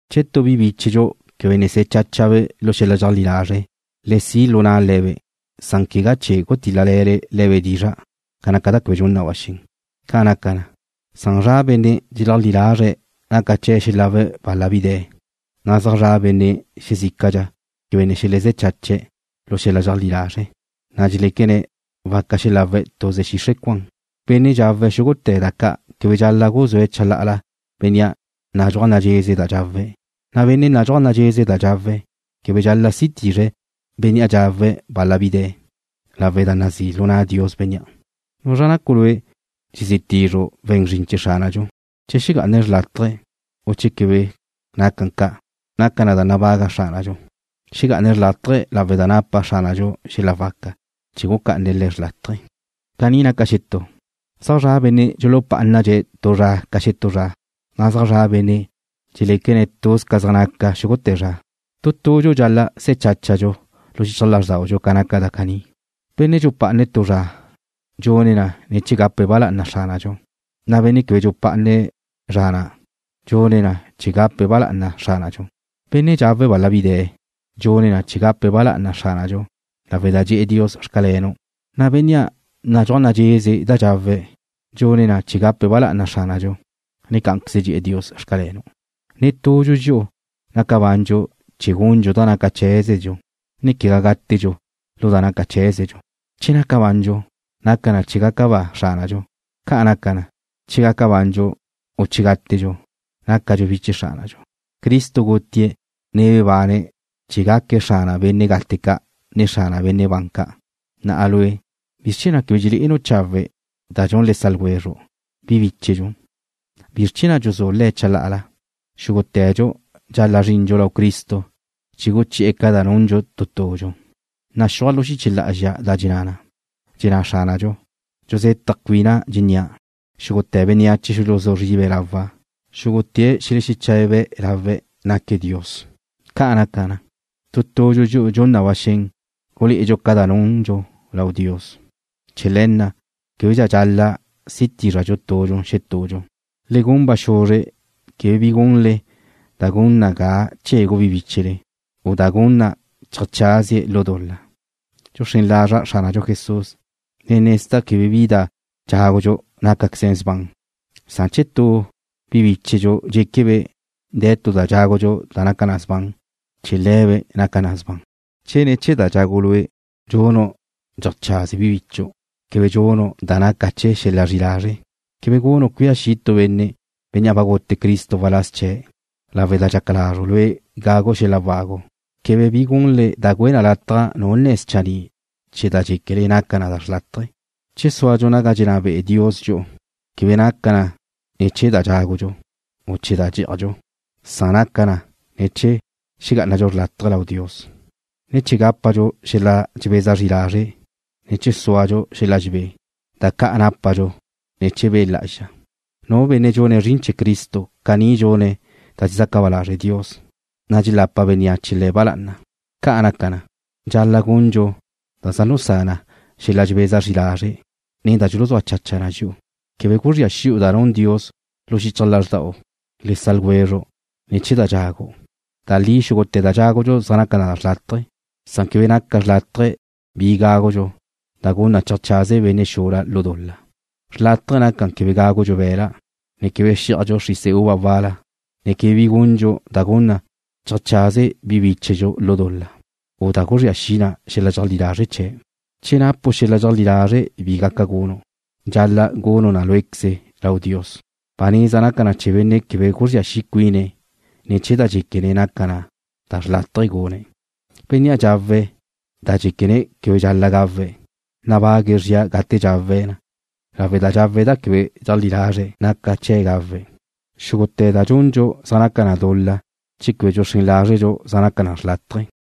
Che tu bi bíchedxu quebe ne se̱ cháchabe' lu xel-la dxeajlí lazre', le si' lu na'le le̱be', san quegá chee̱ gutíl-lale̱le le̱be' dizra' ca naca da quebe dxun na ba xen. Ca naca na, zaj zra' benne' dxeleajlí lazre̱' naca chee̱' xelawe̱' bal-la bi de̱, san zaj zra' benne' xezícadxa quebe ne xelezé̱ chache̱' lu xel-la dxeajlí lazre', na' dxeléquene̱' waca xelawe̱' tuze xixre' cuan. Benne' dxawe̱' xúgute̱ da ca' quebe dxal-la' guzúe̱' chalá'ala bénnea' nadxúaj nadxeze da dxawe̱', na' benne' nadxúaj nadxeze da dxawe̱' quebe dxal-la' si tizre̱' bénnea' dxawe̱' bal-la bi de̱, lawe' da nazí' lu na' Dios bénnea'. ¿Nuzra nacu' lue' dxezí tizru' we̱n zrin chee̱ Xránadxu? Che xegá'ane̱' xrlátaje, u che quegá, naca na da nabaga Xránadxu. Xegá'ane̱' xrlátaje lawe' da napa Xránadxu xel-la waca chee̱ gucá'ane̱' le̱' xrlátaje. Caní naca xetú. Zaj zra' benne' dxulupá'anadxe̱' tu zra ca xetú zra, na' zaj zra' benne' dxeléquene̱' tuz ca zaj naca xúgute̱ zra. Tu tudxu dxal-la' se̱ cháchadxu lu xichaj lázrdaudxu ca naca da caní. Benne' dxupá'ane̱' tu zra dxune̱' na chee̱ gape̱' ba lá'ana Xránadxu, na' bénnea' quebe dxupá'ane̱' zra na' dxune̱' ca' chee̱ gape̱' ba lá'ana Xránadxu. Benne' dxawe̱' bal-la bi de̱ dxune̱' na chee̱ gape̱' ba lá'ana Xránadxu lawe' da dxe̱'e̱ Dios: Xcalenu', na' bénnea' nadxúaj nadxeze da dxawe̱' dxune̱' na chee̱ gape̱' ba lá'ana Xránadxu, na' cá'anqueze dxe̱'e̱ Dios: Xcalenu'. Netudxu dxi'u naca bandxu chee̱ gundxu da naca cheé̱zedxu, ne quegá gátedxu lu da naca cheé̱zedxu. Che naca bandxu, naca na chee̱ gaca ba Xránadxu. Ca' naca na, che gaca bandxu, u che gátedxu nácadxu bi chee̱ Xránadxu. Cristo gutie̱', ne bebane̱' chee̱ gaque̱' Xrana benne' gate ca', ne Xrana benne' ban ca'. Na'a lue', ¿bizr chee̱ na' quebe dxelé'enu' chawe' ca da dxun le sa' ljwezru', bi bíchedxu? ¿Bizr chee̱ na' dxuzú' le̱' chalá'ala? Xúgute̱dxu dxal-la' zrindxu lau Cristo chee̱ guchi'e̱ ca da nundxu tu tudxu. Naxúaj lu xiche lá'azxa da dxenná na: Dxenná Xránadxu: “Dxuzetaj cuina' dxennía': Xúgute̱ bénneache xuluzú zribe̱' lawa'. Xúgute̱' xelexeche̱be̱' lawe' lau naca' Dios.” Ca'an naca, tu tudxu dxi'u dxun na ba xen gulé'edxu ca da nundxu lau Dios. Chee̱ le̱ na' québedxa dxal-la' si tízradxu tudxu xetudxu. Le gun ba xuzre quebe bi gunle da gun na ga chegu bi bíchele, u da gun na cheajcházie̱' lu dul-la. Dxuxrén lazra' Xránadxu Jesús, ne nezda' quebe bi da dxágudxu nácaqueze sban, san che tu bi bíchedxu dxéquebe' de̱ tu da dxágudxu da naca na sban, chee̱ le̱be' naca na da sban. Che ne̱ chee̱ da dxagu' lue', dxunu' dxeajchaze bi bichu', quebe dxunu' da naca chee̱ xel-la zri'i lazre'. Quebe gunu' cuía xi' tu benne', bénnea' gute Cristo waláz chee̱', lawe' da dxaca lazru' lue' gagu' bi xel-la wagu. Quebe bi gunle da güe lataj nu nne̱ schanní' chee̱ da dxéquele naca na da xrlátaje. Chee̱ súadxu naga dxenná be'e Dios dxi'u quebe naca na chee̱ da dxágudxu, u chee̱ da dxí'ajdxu, san naca na chee̱ xegá'anadxu xrlátaje lau Dios, ne chee̱ gápadxu xel-la dxebeza zri lazre', ne chee̱ súadxu xel-la dxebé, da ca' nápadxu ne̱ chee̱ Be' Lá'azxa. Nu benne' dxune̱' zrin chee̱ Cristo caní dxune̱' da dxezaca ba lazre' Dios, na' dxelapa bénneache le̱' ba lá'ana. Ca' naca na, dxal-la' gundxu da dxulusá na xel-la dxebeza zri lazre', ne da dxuluzúa chacha na dxi'u. Quebe guzría xi'u da nun Dios lu xichaj lázrdau le sa' ljwezru' ne̱ chee̱ da dxagu'. Da li xúgute̱ da dxágudxu zaj naca na xrlátaje, san quebe naca xrlátaje bi gágudxu da gun na cheajchaze benne' xula lu dul-la. Xrlátaje naca quebe gágudxu be̱la', ne quebe xí'ajdxu xrise uva wal-la, ne quebe bi gundxu da gun na cheajchaze bi bíchedxu lu dul-la, u da guzría xi na xel-la dxeajlí lazre' chee̱'. Che napu' xel-la dxeajlí lazre' bi gaca gunu', dxal-la' gunu' na lué'queze lau Dios. Ba neza naca na chee̱ benne' quebe guzría xi' cuine̱' ne̱ chee̱ da dxéquene̱' naca na da xrlátaje gune̱'. Bénnea' dxawe̱' da dxéquene̱' quebe dxal-la' gawe̱', nabague̱' zria gate dxawe̱' na lawe' da dxawe̱' da quebe dxeajlí lazre̱' naca chee̱' gawe'. Xúgute̱ da dxundxu zaj naca dul-la che quebe dxuxrén lázredxu zaj naca na xrlátaje.